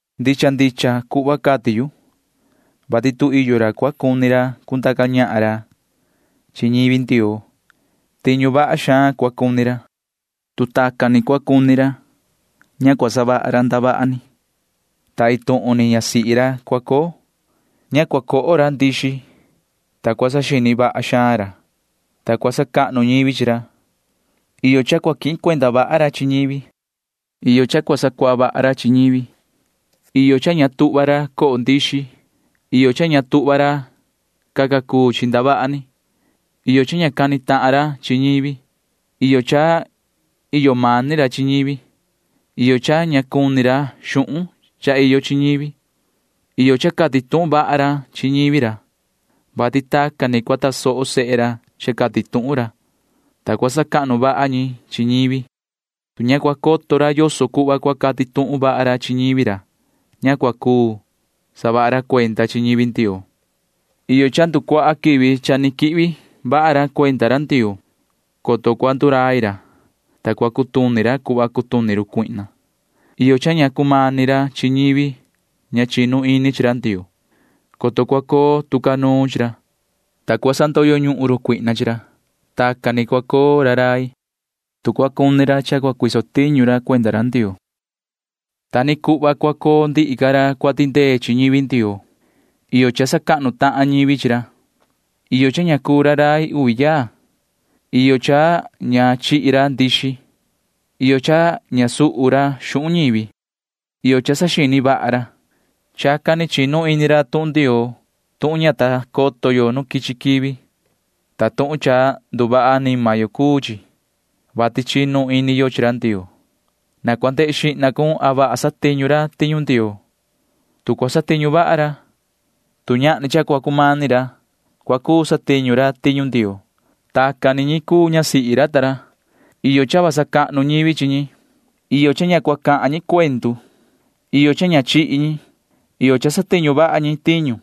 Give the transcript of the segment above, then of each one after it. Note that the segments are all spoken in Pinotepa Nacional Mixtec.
Ndicha ndicha cuhva cati yu, vati tu iyo ra cua cuni ra cundaca ñahan ra chi ñivi Ndioo, tiñu vaha xaan cua cuni ra. Iyo cha ña tuhva ra savaha ndavaha ni, ta iin tuhun ni ñasihi ra iyo chi ra. Iyo cha ña tuhva ra chihi ndixi. Iyo cha saxini vaha xaan ra. Iyo cha sacahnu ñivi chi ra. Iyo cha quihin cuenda vaha ra chi ñivi. Iyo cha sacuaha vaha ra chi ñivi. Iyo cha ña tuhva ra coho ndixi. Iyo cha ña tuhva ra caca cuu chi ndavaha ni. Iyo cha ña cani tahan ra chi ñivi. Iyo cha iyo mani ra chi ñivi. Iyo cha ña cuni ra xuhun cha iyo chi ñivi. Iyo cha cati tuhun vaha ra chi ñivi ra, vati tacan ni cua tasoho sehe ra cha cati tuhun ra, ta cua sacahnu vaha ñi chi ñivi. Tu ña cua coto ra yoso cuhva cua cati tuhun vaha ra chi ñivi ra, ña cua cuu saha ra cuenda chi ñivi Ndioo. Iyo cha nducuaha quivi cha ni quihvi vaha ra cuenda ra Ndioo, coto cua ndurai ra, ta cua cutuni ra cuhva cutuni run cuihna. Iyo cha ña cumani ra chi ñivi ña chinu ini chi ra Ndioo, coto cua coo tu ca nuun chi ra, ta cua sandoyo ñuhun run cuihna chi ra. [Tacan ni cua coo ra rai, tu cua cuni ra cha cua cuu ra tiñu cuenda ra Ndioo.] Ta ni cuhva cua coo ndihi ca ra cua tindee chi ñivi Ndioo. Iyo cha sacahnu tahan ñivi chi ra. Iyo cha ña cuu ra rai uvi yaa. Iyo cha ña chihi ra ndixi. Iyo cha ña suhu ra xuhun ñivi. Iyo cha saxini vaha ra. Chacan ni chinu ini ra tuhun Ndioo tuhun ña ta coto yo nu quichi quivi, ta tuhun cha nduvaha anima yo cuu chi, vati chinu ini yo chi ra Ndioo. Na cua ndehe xihna cun a vaha satiñu ra tiñu Ndioo. Tu cua satiñu vaha ra, tu ñahni cha cua cumani ra, cua cuu satiñu ra tiñu Ndioo. Tacan tucu cuenda ñasihi ra ta ra―iyo cha sacahnu ñivi chi ñi. Iyo cha ña cahan ñi cuendu. Iyo cha ña chihi ñi. Iyo cha satiñu vaha ñi tiñu.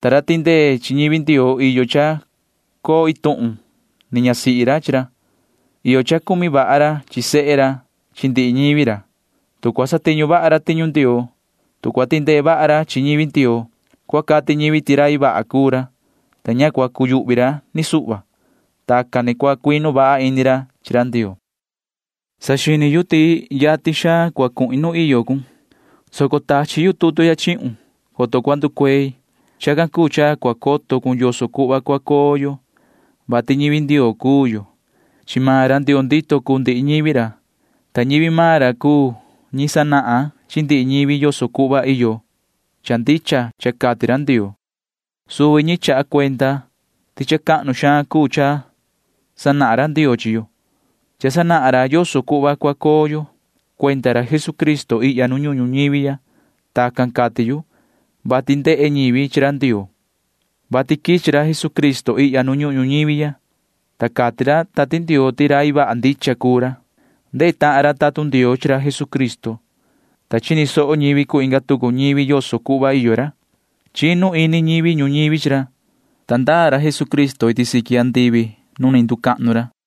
Ta ra tindee chi ñivi Ndioo iyo cha coo iin tuhun ni ñasihi ra chi ra. Iyo cha cumi vaha ra chi sehe ra chi ndihi ñivi ra. Tu cua satiñu vaha ra tiñu Ndioo, tu cua tindee vaha ra chi ñivi Ndioo, cua cati ñivi ti rai vaha cuu ra, ta ña cua cuyuhvi ra ni suhva. Tacan ni cua cuinu vaha ini ra chi ra Ndioo. Saxini yu ti yatin xaan cua cuhin nu iyo cun, soco tachi yu tutu ya chihun, coto cua nducuei. Chacan cuu cha cua coto cun yoso cuhva cua coo yo, vati ñivi Ndioo cuu yo. Chi maan ra Ndioo ndito cuu ndihi ñivi ra, ta ñivi maan ra cuu ñi sanahan chi ndihi ñivi yoso cuhva iyo cha ndicha cha cati ra Ndioo. Suvi ñi cuu ñi chaha cuenda ti cha cahnu xaan cuu cha sanahan ra Ndioo chi yo. Cha sanahan ra yoso cuhva cua coo yo cuenda ra Jesucristo ihya nu ñuhun ñuñivi ya. Tacan cati yu, vati Ndehe ñivi chi ra Ndioo, vati quichi ra Jesucristo ihya nu ñuhun ñuñivi ya, ta cati ra Tati Ndioo ti rai vaha ndicha cuu ra. Ndehe tahan ra tatun Ndioo chi ra Jesucristo, ta chini soho ñivi cuu inga tucu ñivi yoso cuhva iyo ra. Chinu ini ñivi ñuñivi chi ra, ta ndaa ra Jesucristo iti siqui andivi nu ni nducahnu ra.